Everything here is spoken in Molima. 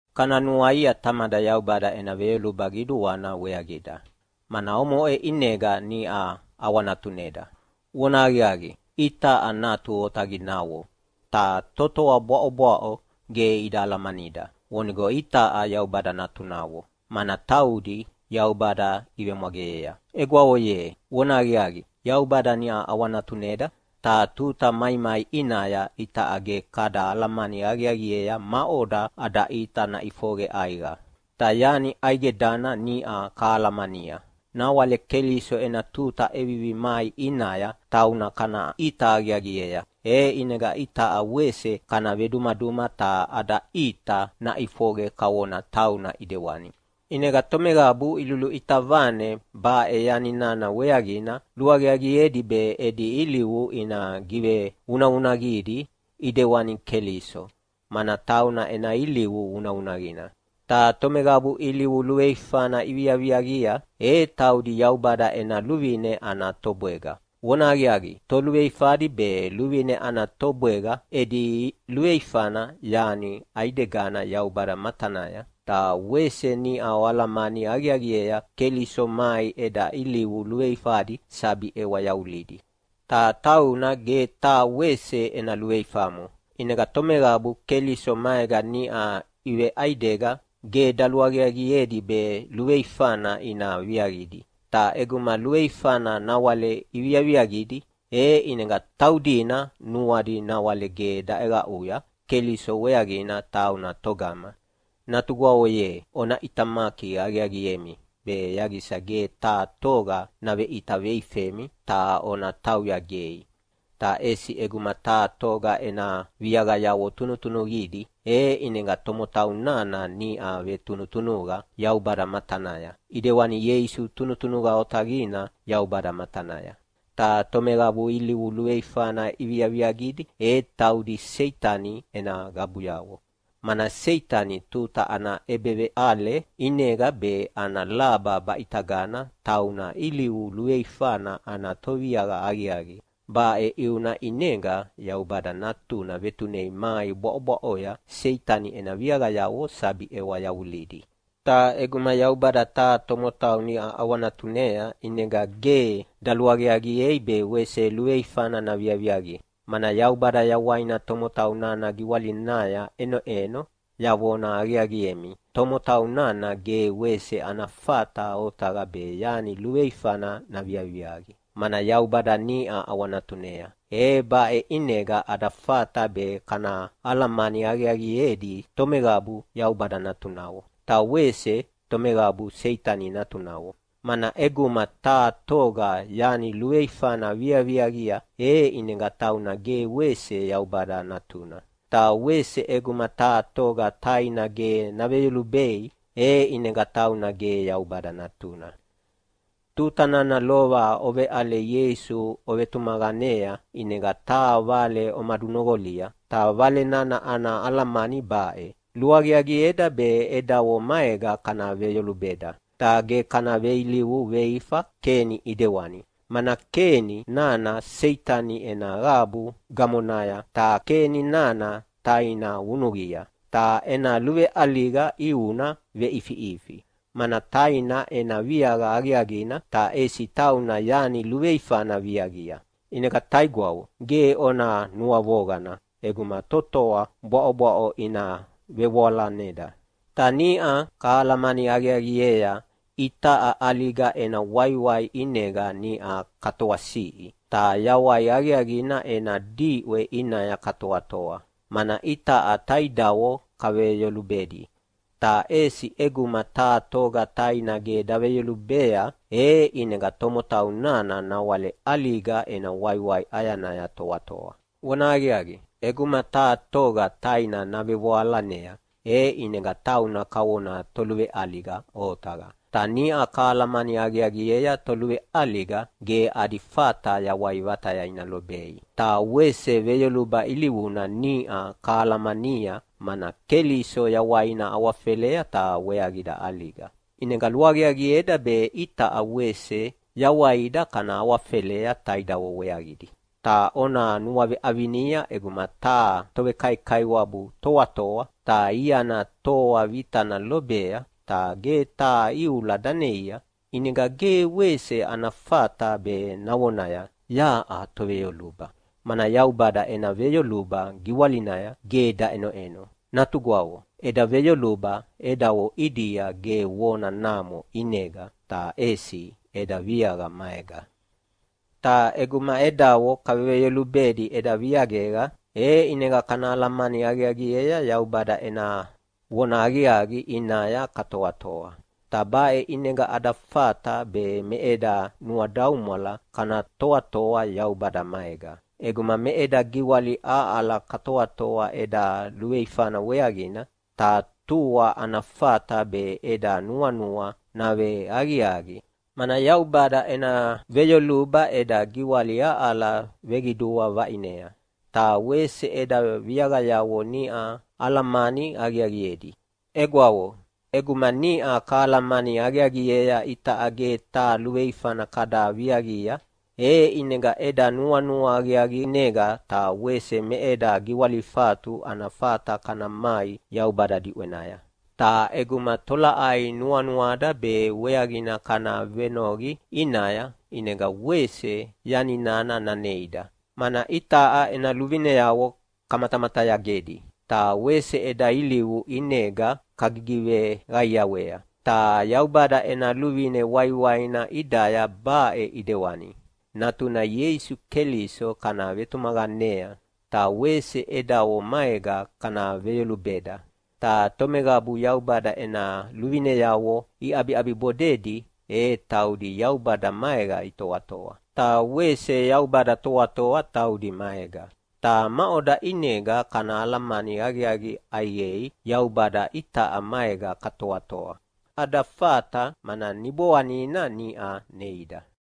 Kana nuaia Tamada Yaubada ena veyoluba qiduana weaqida, mana omoʼe ʼinega niʼa ʼawanatuneda. Vonahaqiaqi, itaʼa natu otaqinavo. Ta totoa bwaʼobwaʼo ge ida alamanida vonigo itaʼa Yaubada natunavo, mana taudi Yaubada ivemwageyea. Egwavo ye, vonahaqiaqi Yaubada niʼa ʼawanatuneda, ta tuta maimai ʼinaya itaʼa ge kada alamani aqiaqiea maʼoda ada ʼita naʼifoqe ʼaiqa. Ta yani ʼaidegana niʼa kahalamania, nawale Keliso ena tuta ʼevivi mai ʼinaya tauna kana ʼita aqiaqiea, e ʼinega itaʼa wese kana vedumaduma ta ada ʼita naʼifoqe kavona tauna ʼidewani. ʼInega tomeqabu iluluʼita vane baʼe yani nana weaqina luaqiaqiedi be edi ilivu ina givevunavunaqidi ʼidewani Keliso, mana tauna ena ilivu vunavunaqina. Ta tomeqabu ilivu luveifana iviaviaqia, e taudi Yaubada ena luvine ana tobwega. Vonahaqiaqi, toluveifadi be luvine ana tobwega edi luveifana yani ʼaidegana Yaubada matanaya. Ta wese niʼa oalamani aqiaqiea Keliso mai eda ilivu luveifadi sabi ʼewa yavulidi. Ta tauna ge taha wese ena luveifamo. ʼInega tomeqabu Keliso maega niʼa iveʼaidega ge daluaqiaqiedi be luveifana ina viaqidi. Ta ʼeguma luveifana nawale iviaviaqidi, e ʼinega taudina nuadi nawale ge daʼeqaʼuya Keliso weaqina tauna togama. Natugwavo ye, ona ʼitamaki aqiaqiemi be yaqisa ge taha toga naveʼita veifemi ta ona tauya gei. Ta ʼesi ʼeguma taha toga ena viaqayavo tunutunuqidi, e ʼinega tomotau nana niʼa vetunutunuqa Yaubada matanaya, ʼidewani Ieisu tunutunuqa otaqina Yaubada matanaya. Ta tomeqabu ilivu luveifana iviaviaqidi e taudi Seitani ena qabuyavo, mana Seitani tuta ana ʼebeveʼale ʼinega be ana laba baʼitagana tauna ilivu luveifana ana toviaqa aqiaqi. Baʼe ʼiuna ʼinega Yaubada Natuna vetunei mai bwaʼobwaʼoya Seitani ena viaqayavo sabi ʼewa yavulidi. Ta ʼeguma Yaubada taha tomotau niʼa ʼawanatunea ʼinega ge daluaqiaqiei be wese luveifana naviaviaqi, mana Yaubada yawaina tomotau nana giwalinaya ʼenoʼeno. Yavona aqiaqiemi, tomotau nana ge wese ana fata otaqa be yani luveifana naviaviaqi, mana Yaubada niʼa ʼawanatunea! E baʼe ʼinega ada fata be kanahalamani aqiaqiedi tomeqabu Yaubada natunavo, ta wese tomeqabu Seitani natunavo, mana ʼeguma taha toga yani luveifana viaviaqia e ʼinega tauna ge wese Yaubada natuna. Ta wese ʼeguma taha toga taina ge naveyolubei, e ʼinega tauna ge Yaubada natuna. Tuta nana lova oveʼale Ieisu ovetumaqanea ʼinega taha vale omadunoqolia, ta vale nana ana alamani baʼe: Luaqiaqieda be edavo maega kana veyolubeda. Ta ge kana veilivu veifa Keni ʼidewani, mana Keni nana Seitani ena qabu gamonaya. Ta Keni nana taina vunuqia, ta ena luveʼaliga ʼiuna veʼifiʼifi, mana taina ena viaqa aqiaqina, ta ʼesi tauna yani luveifana viaqia. ʼInega taigwavo, ge ona nuavoqana ʼeguma totoa bwaʼobwaʼo ina vevoalaneda. Ta niʼa kahalamani aqiaqiea itaʼa ʼaliga ena waiwai ʼinega niʼa katoasiʼi ta yawai aqiaqina ena diʼwe ʼinaya katoatoa, mana itaʼa taidavo kaveveyolubedi. Ta ʼesi ʼeguma taha toga taina ge daveyolubea, e ʼinega tomotau nana nawale ʼaliga ena waiwai ʼayanaya toatoa. Vonahaqiaqi, ʼeguma taha toga taina navevoalanea, e ʼinega tauna kavona toluveʼaliga otaqa. Ta niʼa kahalamani aqiaqiea toluveʼaliga ge adi fata yawai vataya ina lobei. Ta wese veyoluba ilivuna niʼa kahalamania, mana Keliso yawaina awafelea ta weaqida ʼaliga. ʼInega luaqiaqieda be itaʼa wese yawaida kana awafelea taidavo weaqidi. Ta ona nuaveʼavinia ʼeguma taha tovekaikaiwabu toatoa, ta iana toa vitana lobea, ta ge taha iula daneia, ʼinega ge wese ana fata be navonaya, “Yaʼa toveyoluba!” Mana Yaubada ena veyoluba giwalinaya ge daʼenoʼeno. Natugwavo, eda veyoluba edavo ʼidia ge vona namo ʼinega, ta ʼesi eda viaqa maega. Ta ʼeguma edavo kaveveyolubedi eda viaqega, e ʼinega kana alamani aqiaqiea Yaubada ena vonahaqiaqi ʼinaya katoatoa. Ta baʼe ʼinega ada fata be me eda nuadaumwala kana toatoa Yaubada maega. ʼEguma me eda giwali aʼala katoatoa eda luveifana weaqina, ta tua ana fata be eda nuanua naveaqiaqi, mana Yaubada ena veyoluba eda giwali aʼala veqidua vaʼinea, ta wese eda viaqayavo niʼa alamani aqiaqiedi. Egwavo, ʼeguma niʼa kahalamani aqiaqiea itaʼa ge taha luveifana kada viaqia, e ʼinega eda nuanua aqiaqinega ta wese me eda giwalifatu ana fata kana mai Yaubada diʼwenaya. Ta ʼeguma tolaʼai nuanuada be weaqina kana venoqi ʼinaya, ʼinega wese yani nana naneida, mana itaʼa ena luvineavo kamatamatayagedi, ta wese eda ilivu ʼinega kagigiveqaiawea. Ta Yaubada ena luvine waiwaina ʼidaya baʼe ʼidewani: Natuna Ieisu Keliso kana vetumaqanea, ta wese edavo maega kana veveyolubeda. Ta tomeqabu Yaubada ena luvineavo iʼabiʼabibodedi e taudi Yaubada maega itoatoa, ta wese Yaubada toatoa taudi maega. Ta maʼoda ʼinega kana alamani aqiaqi ʼaiqei Yaubada itaʼa maega katoatoa? Ada fata, mana Niboanina niʼa neida.